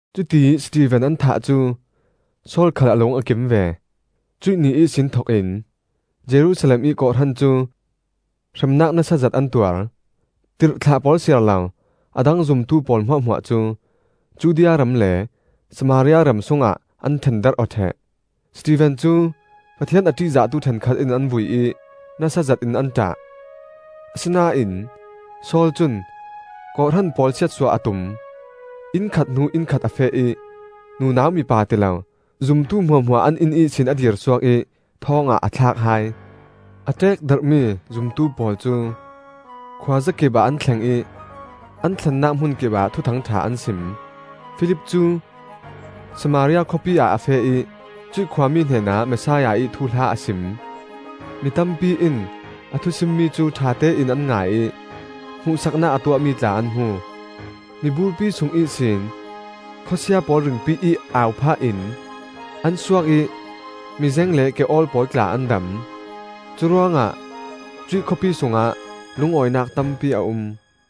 Cutiih Stefen an thah cu Saul khal a lung a kim ve. Cuih ni ihsin thokin Jerusalem ih kawhhran cu hremnak nasa zet an tuar. Tirhthlah pawl siarlo a dang zumtu pawl hmuahhmuah cu Judea ram le Samaria ram sungah an ṭhendarh aw ṭheh. Stefen cu Pathian a ṭihzahtu ṭhenkhat in an vui ih nasa zetin an ṭah. Asinain Saul cun kawhhran pawl siatsuah a tum; inn khat hnu inn khat a feh ih nunau mipa tilo zumtu hmuahhmuah an inn ihsin a dirsuak ih thawng ah a thlak hai. A ṭekdarhmi zumtu pawl cu khuazakipah an thleng ih an thlennak hmunkipah Thuthang ṭha an sim. Filip cu Samaria khawpi ah a feh ih cuih khuami hnenah Messiah ih thuhla a sim. Mi tampi in a thusimmi cu ṭhatein an ngai ih hmuhsaknak a tuahmi tla an hmu. Miburpi sung ihsin khawsia pawl ringpi ih au phah in an suak ih mizeng le ke-awl pawl tla an dam. Curuangah cuih khawpi sungah lungawinak tampi a um.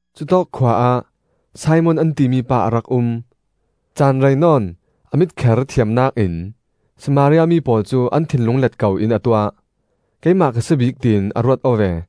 Cutawk khua ah Simon an timi pa a rak um. Caan rei nawn a mitkher thiamnak in Samaria mi pawl cu an thinlung let ko in a tuah. Keimah ka si bik tiin a ruat aw ve.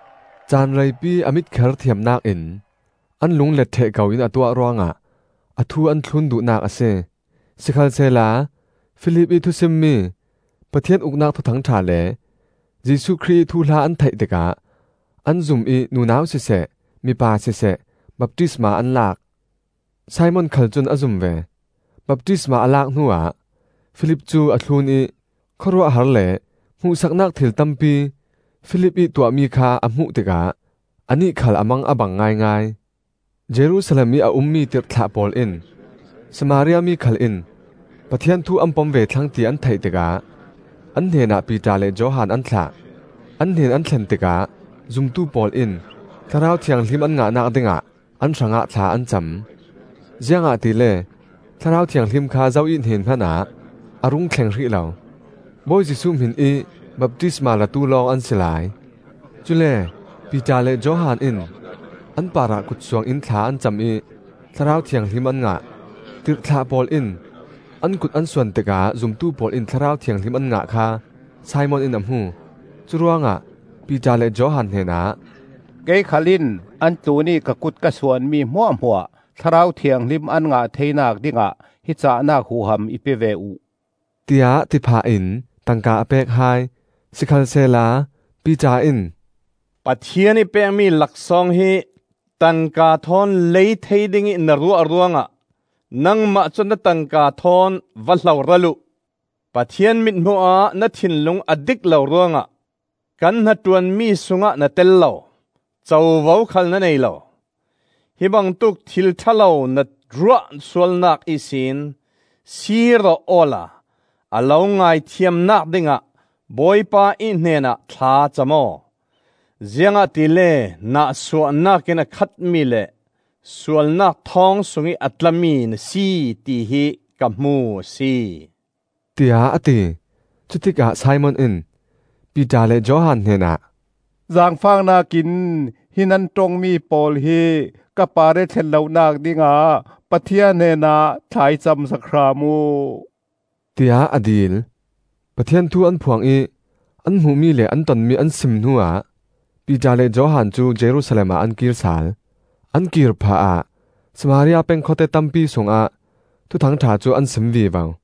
Caan reipi a mitkher thiamnak in an lung let ṭheh ko in a tuah ruangah a thu an thlun duhnak a si. Sikhalsehla Filip ih thusimmi Pathian Uknak Thuthang ṭha le Jesuh Khrih ih thuhla an theih tikah an zum ih nunau siseh mipa siseh baptisma an lak. Simon khal cun a zum ve; baptisma a lak hnuah Filip cu a thlun ih khawruahhar le hmuhsaknak thil tampi Filip ih tuahmi kha a hmuh tikah anih khal a mang a bang ngaingai. Jerusalem ih a ummi tirhthlah pawl in Samaria mi khal in Pathian thu an pom ve thlang ti an theih tikah an hnenah Piter le Johan an thlah. An hnen an thlen tikah zumtu pawl in Thlarau Thianghlim an ngahnak dingah an hrangah thla an cam. Ziangahtile Thlarau Thianghlim kha zo ih hnen hmanah a rung thleng hrih lo; Bawi Jesuh hminih baptisma latu lawng an si lai. Cule Piter le Johan in an parah kut suangin thla an cam ih Thlarau Thianghlim an ngah. Tirhthlah pawl in an kut an suan tikah zumtu pawl in Thlarau Thianghlim an ngah kha Simon in a hmu. Curuangah Piter le Johan hnenah, “Kei khal in an tlunih ka kut ka suanmi hmuahhmuah Thlarau Thianghlim an ngah theinak dingah hi cahnak huham i pe ve uh,” tiah ti phah in tangka a pek hai. Sikhalsehla Piter in, “Pathian ih pekmi laksawng hi tangka thawn lei thei dingih na ruah ruangah nangmah cu na tangka thawn va hloral uh! Pathian mithmuh-ah na thinlung a dik lo ruangah kan hnaṭuanmi sungah na tel lo, covo khal na nei lo. Hi bangtuk thil ṭha lo na ruah sualnak ihsin siir aw awla a lo ngaithiamnak dingah Bawipa ih hnenah thlacam aw. Ziangahtile nahsuahnak in a khatmi le sualnak thawng sungih a tlami na si, tihi ka hmu a si,” tiah a ti. Cutikah Simon in Piter le Johan hnenah, “Zaangfahnak in hi nan ṭongmi pawl hi ka parih a thlen lonak dingah Pathian hnenah thla i cam sak hram uh,” tiah a dil. Pathian thu an phuang ih an hmuhmi le an tonmi an sim hnuah Piter le Johan cu Jerusalem ah an kir sal. An kir phahah Samaria peng khawte tampi sungah Thuthang ṭha cu an sim vivo.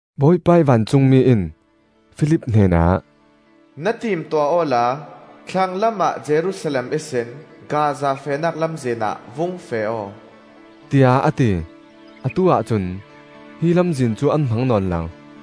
Bawipa ih vancungmi in Filip hnenah, “Na timtuah awla thlanglam ah Jerusalem ihsin Gaza fehnak lamzin ah vung feh aw,” tiah a ti. (Atu-ah cun hi lamzin cu an hmang nawn lo.)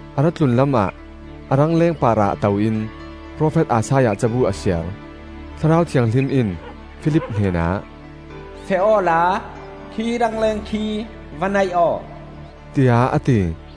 A ra tlunlam ah a rangleng parah to in profet Isaiah cabu a siar. Thlarau Thianghlim in Filip hnenah, “Feh awla khi rangleng khi va naih aw,” tiah a ti.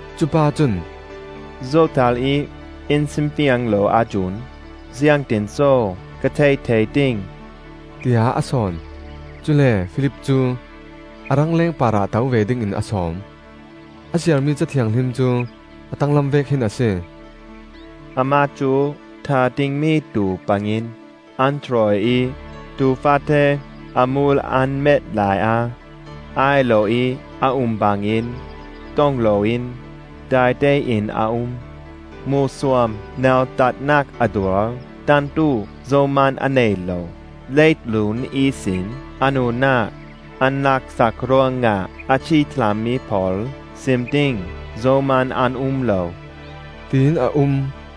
Cupa cun, “Zotal ih in simfiang lo ahcun ziangtinso ka theih thei ding?” tiah a sawn. Cule Filip cu a rangleng parah to ve dingin a sawm. A siarmi Ca Thianghlim cu a tanglam vek hin a si: “Amah cu thah dingmi tuu bangin an hruai ih, Tuu faate a hmul an met laiah ai loih a um bangin, ṭong loin daitein a um. Hmuhsuam nautatnak a tuar, ṭantu zohman a nei lo; Leitlun ihsin a nunnak an laksak ruangah, A ci thlahmi pawl sim ding zohman an um lo,” tiin a um.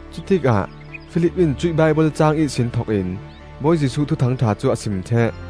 Cutikah Filip in cuih Baibal caang ihsin thokin Bawi Jesuh Thuthang ṭha cu a sim ṭheh.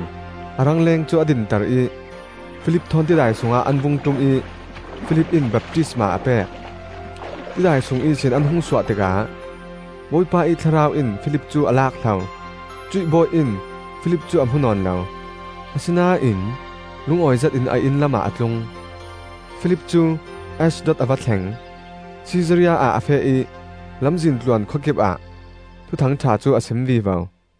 Cuih Ethiopia pa cun a rangleng cu a dinter ih Filip thawn tidai sungah an vung ṭum ih Filip in baptisma a pek. Tidai sung ihsin an hung suah tikah Bawipa ih Thlarau in Filip cu a lak hlo. Cuih bawi in Filip cu a hmu nawn lo; asinain lungawi zetin a inn lamah a tlung. Filip cu Ashdod a va thleng; Sisaria ah a feh ih lamzin tluan khua kipah Thuthang ṭha cu a sim vivo.